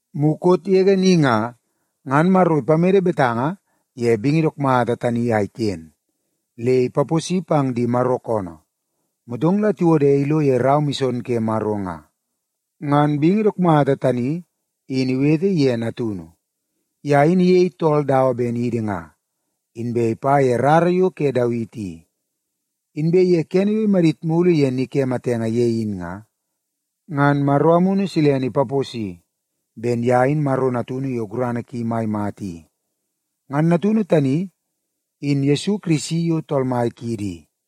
Mukot yege ni nga, ngan Maro ipamede betanga ye bingi dook mata tani a iken, le ipaposi pang di Maro koonoo, motong la tiwode ilo ye rau mison ke Maro nga. Ngan bingi dook mata tani in iwete ye Natunu. Ye in iyei tool dawa ben idi nga, inbe ipa ye rara yo ke Dawiti i. Inbe ye kene yo imadit mulu ye ni ke matenge ye in nga, ngan Maro Amunu Silene ipaposi ben ye in Maro Natunu yo gurana ki mai mata i. Ngan Natunu tani in Yesu Kirisi yo Tool Mai kiidi i.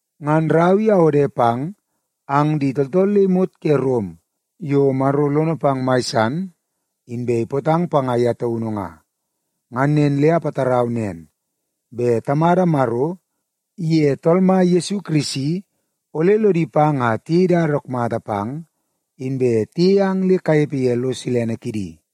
Ngan rau i awode pang ang di tooltool le imot ke Rom yo Maro lono pang mai san, inbe ipootang panga ye taunu nga. Ngan nen le apatarau nen, bet Tamada Maro iye Tool Mai Yesu Kirisi ole lodi pang a tiyei dada dook mata pang, inbe tiyei ang le kanepe ye lo silene kidi.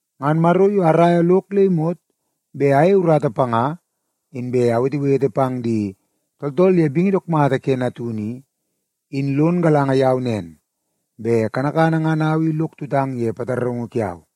Ngan Maro yo araia lok le imot bet ayei urata panga inbe awetewete pang di tooltool ye bingi dook mata ke Natunu i, in lon galanga yau nen, bet kanakana ngan au i lok tutang ye pataraungu kiau.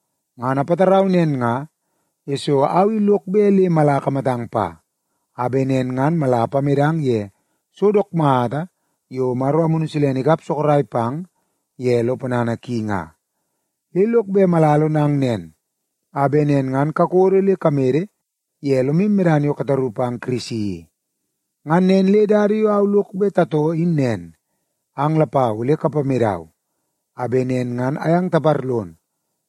Ngan apatarau nen nga, yesoo au i lok bet le mala akamatang pa, a bet nen ngan mala apamedang ye so dook mata yo Maro Amunu Silene ikap sorok pang ye lo ponana ki nga. Le lok bet mala alonang nen, a bet nen ngan kakodo le kamede ye lomu medana yo kataru pang Kirisi i. Ngan nen le dada yo au lok bet tatoo in nen, ang lapau ole kapamedau, a bet nen ngan ayang taparlon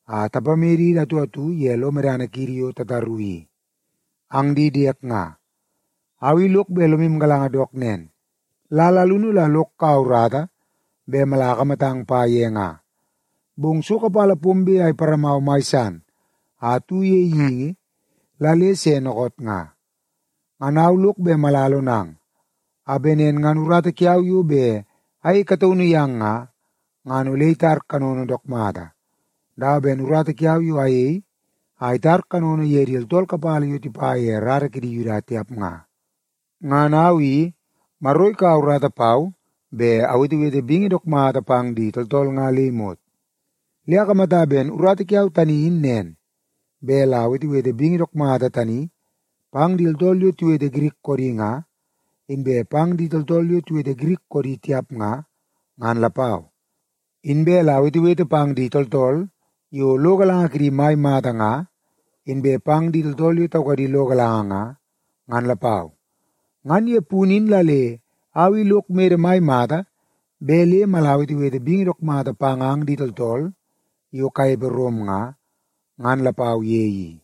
a tapamedidi atu atu ye lo medana kiidi yo tataru i. Ang di diek nga, au i lok bet lomu galanga dook nen, lal alunu la lok kaua urata bet amala akamatang pa ye nga, bong so kapala pombe a iparamau mai san a atu ye geingi la le se dookoot nga. Ngan au lok bet mala alonang, a bet nen ngan urata kiau yo bet ayei kataunu yang nga, ngan ole itar kanono dook mata, dawa ben urata kiau yo ayei a itar kanono ye di tooltool kapala yo tipa ye rara kidi Yuda tiap nga. Ngan au i, Maro ikaua urata pau bet awetewete bingi dook mata pang di tooltool nga le imot. Le akamata ben urata kiau tani in nen, bet la awetewete bingi dook mata tani pang di tooltool yo tiwete Girik koodi nga, inbe pang di tooltool yo tiwete Girik koodi tiap nga, ngan lapau. Inbe la awetewete pang di tooltool yo lo galanga kidi mai mata nga, inbe pang di tooltool yo taukadi lo galanga nga, ngan lapau. Ngan ye punu in la le au i lok mede mai mata bet le mala awetewete bingi dook mata pang ang di tooltool yo kanepe Rom nga, ngan lapau ye i.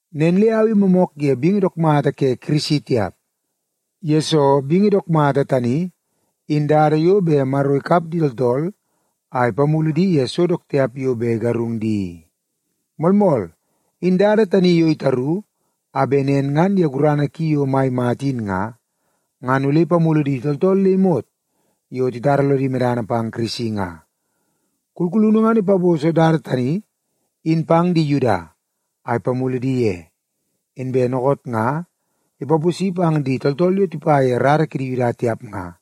Nen le au i moomook ye bingi dook mata ke Kirisi tiap, yesoo bingi dook mata tani in dada yo bet Maro ikap di tooltool a ipamulu di ye so dook tiap yo bet igarung di i. Moolmool, in dada tani yo itaru a bet nen ngan ye gurana ki yo mai mata in nga, ngan ole ipamulu di tooltool le imot yo titara lodi medana pang Kirisi nga. Kulkulunu ngan ipaposo dada tani in pang di Yuda a ipamulu di ye, inbe dookoot nga ipaposi pang di tooltool yo tipa ye rara kidi Yuda tiap nga,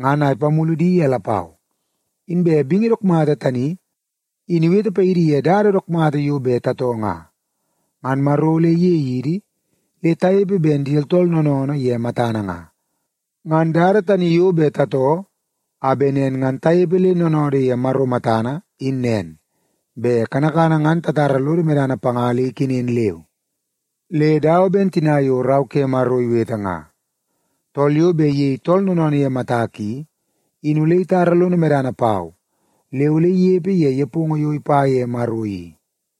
ngan a ipamulu di ye lapau. Inbe bingi dook mata tani in iwete paidi ye dada dook mata yo bet tatoo nga, ngan Maro ole iyei idi le tanepe ben di tooltool noonoonoo ye matana nga. Ngan dada tani yo bet tatoo a bet nen ngan tanepe le noonoodoo ye Maro matana in nen, bet kanakana ngan tatara lodo medana panga le ikenen leu. Le dawa ben tina yo Rau ke Maro iwete nga, “Tool yo bet iyei tool noonoonoo ye matak i, in ole itara lono medana pau le ole inepe ye nepongo yo ipa ye Maro i.”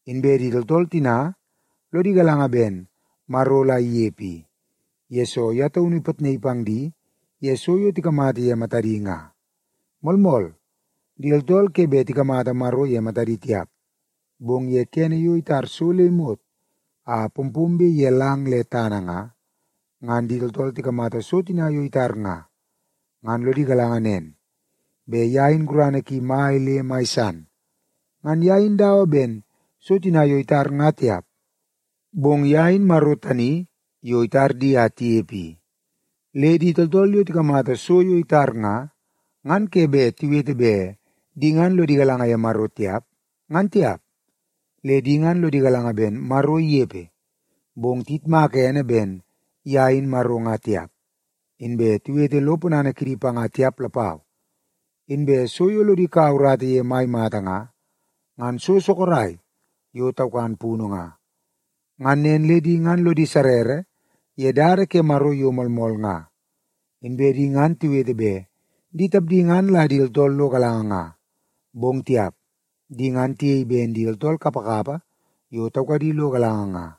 Inbe di tooltool tina lodi galanga ben Maro la inepe i, yesoo ye taunu ipitnaii pang di ye so yo tikamata ye matadi nga. Moolmool, di tooltool ke bet tikamata Maro ye matadi tiap, bong ye kene yo itar so le imot a pompombe ye lang le tana nga, ngan di tooltool tikamata so tina yo itar nga, ngan lodi galanga nen, bet ye in gurana ki mai le mai san. Ngan ye in dawa ben so tina yo itar nga tiap, bong ye in Maro tani yo itar di a tinepe i. Le di tooltool yo tikamata so yo itar nga, ngan ke bet tiwete bet di ngan lodi galanga ye Maro tiap, ngan tiap. Le di ngan lodi galanga ben Maro inepe, bong tiyitmaka ene ben ye in Maro nga tiap, inbe tiwete lo ponana kidi panga tiap lapau. Inbe so yo lodi kaua urata ye mai mata nga, ngan so sorok yo taukan punu nga. Ngan nen le di ngan lodi sarrara ye dada ke Maro yo moolmool nga. Inbe di ngan tiwete bet di tapdi ngan la di tooltool lo galanga nga, bong tiap, di ngan tiyei ben di tooltool kapakapa yo taukadi lo galanga nga.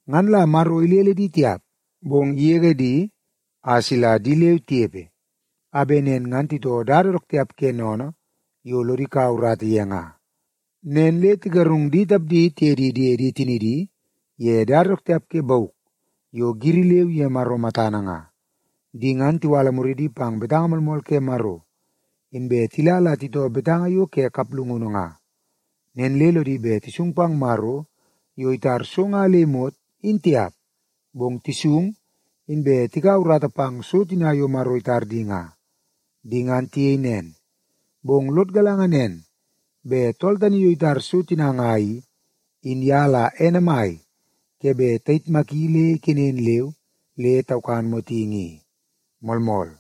Ngan la Maro ilele di tiap, bong igege di a sila di leu tinepe, a bet nen ngan titoo dada dook tiap ke sennene yo lodi kaua urata ye nga. Nen le tigarung di tapdi tiye di diedi tinidi ye dada dook tiap ke bauk yo giri leu ye Maro matana nga. Di ngan tiwala muridi pang betanga moolmool ke Maro, inbe tila la titoo betanga yo ke kaplungunu nga. Nen le lodi bet tisung pang Maro yo itar so nga le imot, in tiap, bong tisung inbe tikau urata pang so tina yo Maro itar di nga. Di ngan tiyei nen, bong lod galanga nen, bet tool tani yo itar so tina nga i, in ye la ene mai ke bet tayitmaki le ikenen leu le taukan motingi i. Moolmool.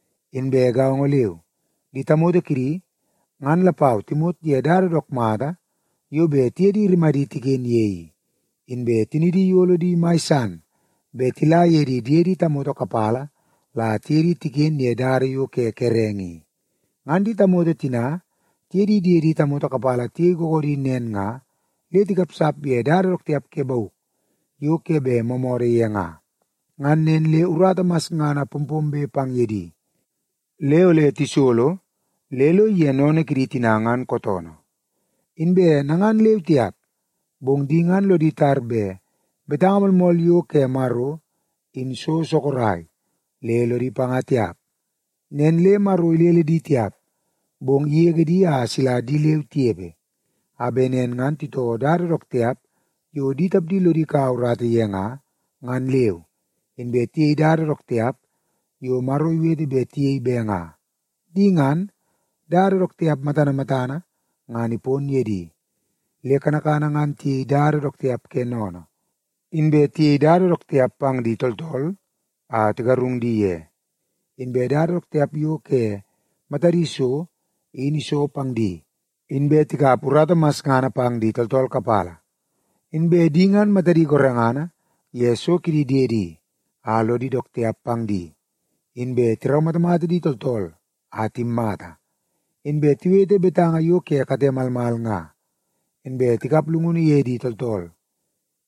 Inbe gaongo leu, di tamoto kidi ngan lapau timot ye dada dook mata yo bet tiye di rimadi tiken ye i, inbe tinidi iyolo di mai san bet tila ye di diede tamoto kapala la tiye di tiken ye dada yo ke kerenge i. Ngan di tamoto tina tiye di diede tamoto kapala tiyei googoodi nen nga, le tikapsap ye dada dook tiap ke bauk yo ke bet moomoodoo ye nga. Ngan nen le urata masngana pompombe pang ye di, le ole tisolo le lo ige sennene kidi tina ngan kootoonoo. Inbe nangan leu tiap, bong di ngan lodi tar bet betanga moolmool yo ke Maro, in so sorok, le lodi panga tiap. Nen le Maro ilele di tiap, bong igege di a sila di leu tinepe, a bet nen ngan titoo dada dook tiap yo di tapdi lodi kaua urata ye nga, ngan leu, inbe tiyei dada dook tiap yo Maro iwete bet tiyei be nga. Di ngan, dada dook tiap matana matana ngan ipon ye di. Le kanakana ngan tiyei dada dook tiap ke sennene, inbe tiyei dada dook tiap pang di tooltool a tigarung di ye, inbe dada dook tiap yo ke matadi so in iso pang di, inbe tikap urata masngana pang di tooltool kapala. Inbe di ngan matadi gorengana ye so kidi diedi a lodi dook tiap pang di, inbe tiraumatamata di tooltool a timmata, inbe tiwete betanga yo ke kate malmal nga, inbe tikap llungunu ye di tooltool.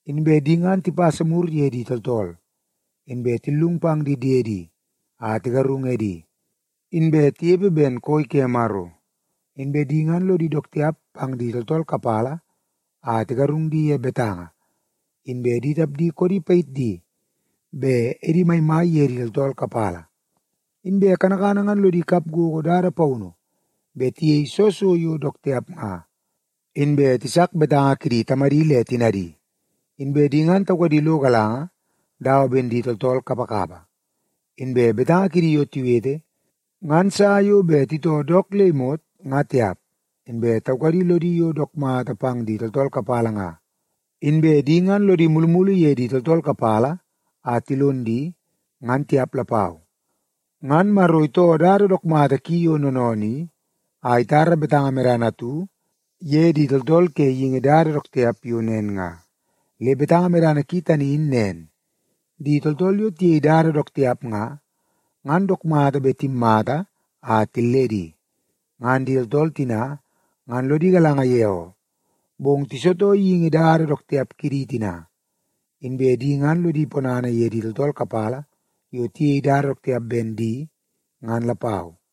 Inbe di ngan tipasa mur ye di tooltool, inbe tillung pang di diedi a tigarung edi, inbe tinepe ben koi ke Maro, inbe di ngan lodi dook tiap pang di tooltool kapala a tigarung di ye betanga, inbe di tapdi koodi payit di bet edi maimai ye di tooltool kapala. Inbe kanakana ngan lodi kap gogo dada paunu bet tiyei soo so yo dook tiap nga, inbe tisak betanga kidi tamadi le tinadi. Inbe di ngan taukadi lo galanga dawa ben di tooltool kapakapa, inbe betanga kidi yo tiwete ngan sa yo bet titoo dook le imot nga tiap, inbe taukadi lodi yo dook mata pang di tooltool kapala nga, inbe di ngan lodi mulumulu ye di tooltool kapala a tilon di, ngan tiap lapau. Ngan Maro itoo dada dook mata ki yo noonoonoo i, a itara betanga medana atu ye di tooltool ke geingi dada dook tiap yo nen nga. Le betanga medana ki tani in nen, di tooltool yo tiyei dada dook tiap nga, ngan dook mata bet timmata a tilledi. Ngan di tooltool tina ngan lodi galanga ye oo, bong tisitoo geingi dada dook tiap kidi tina, inbe di ngan lodi ponana ye di tooltool kapala yo tiyei dada dook tiap ben di, ngan lapau.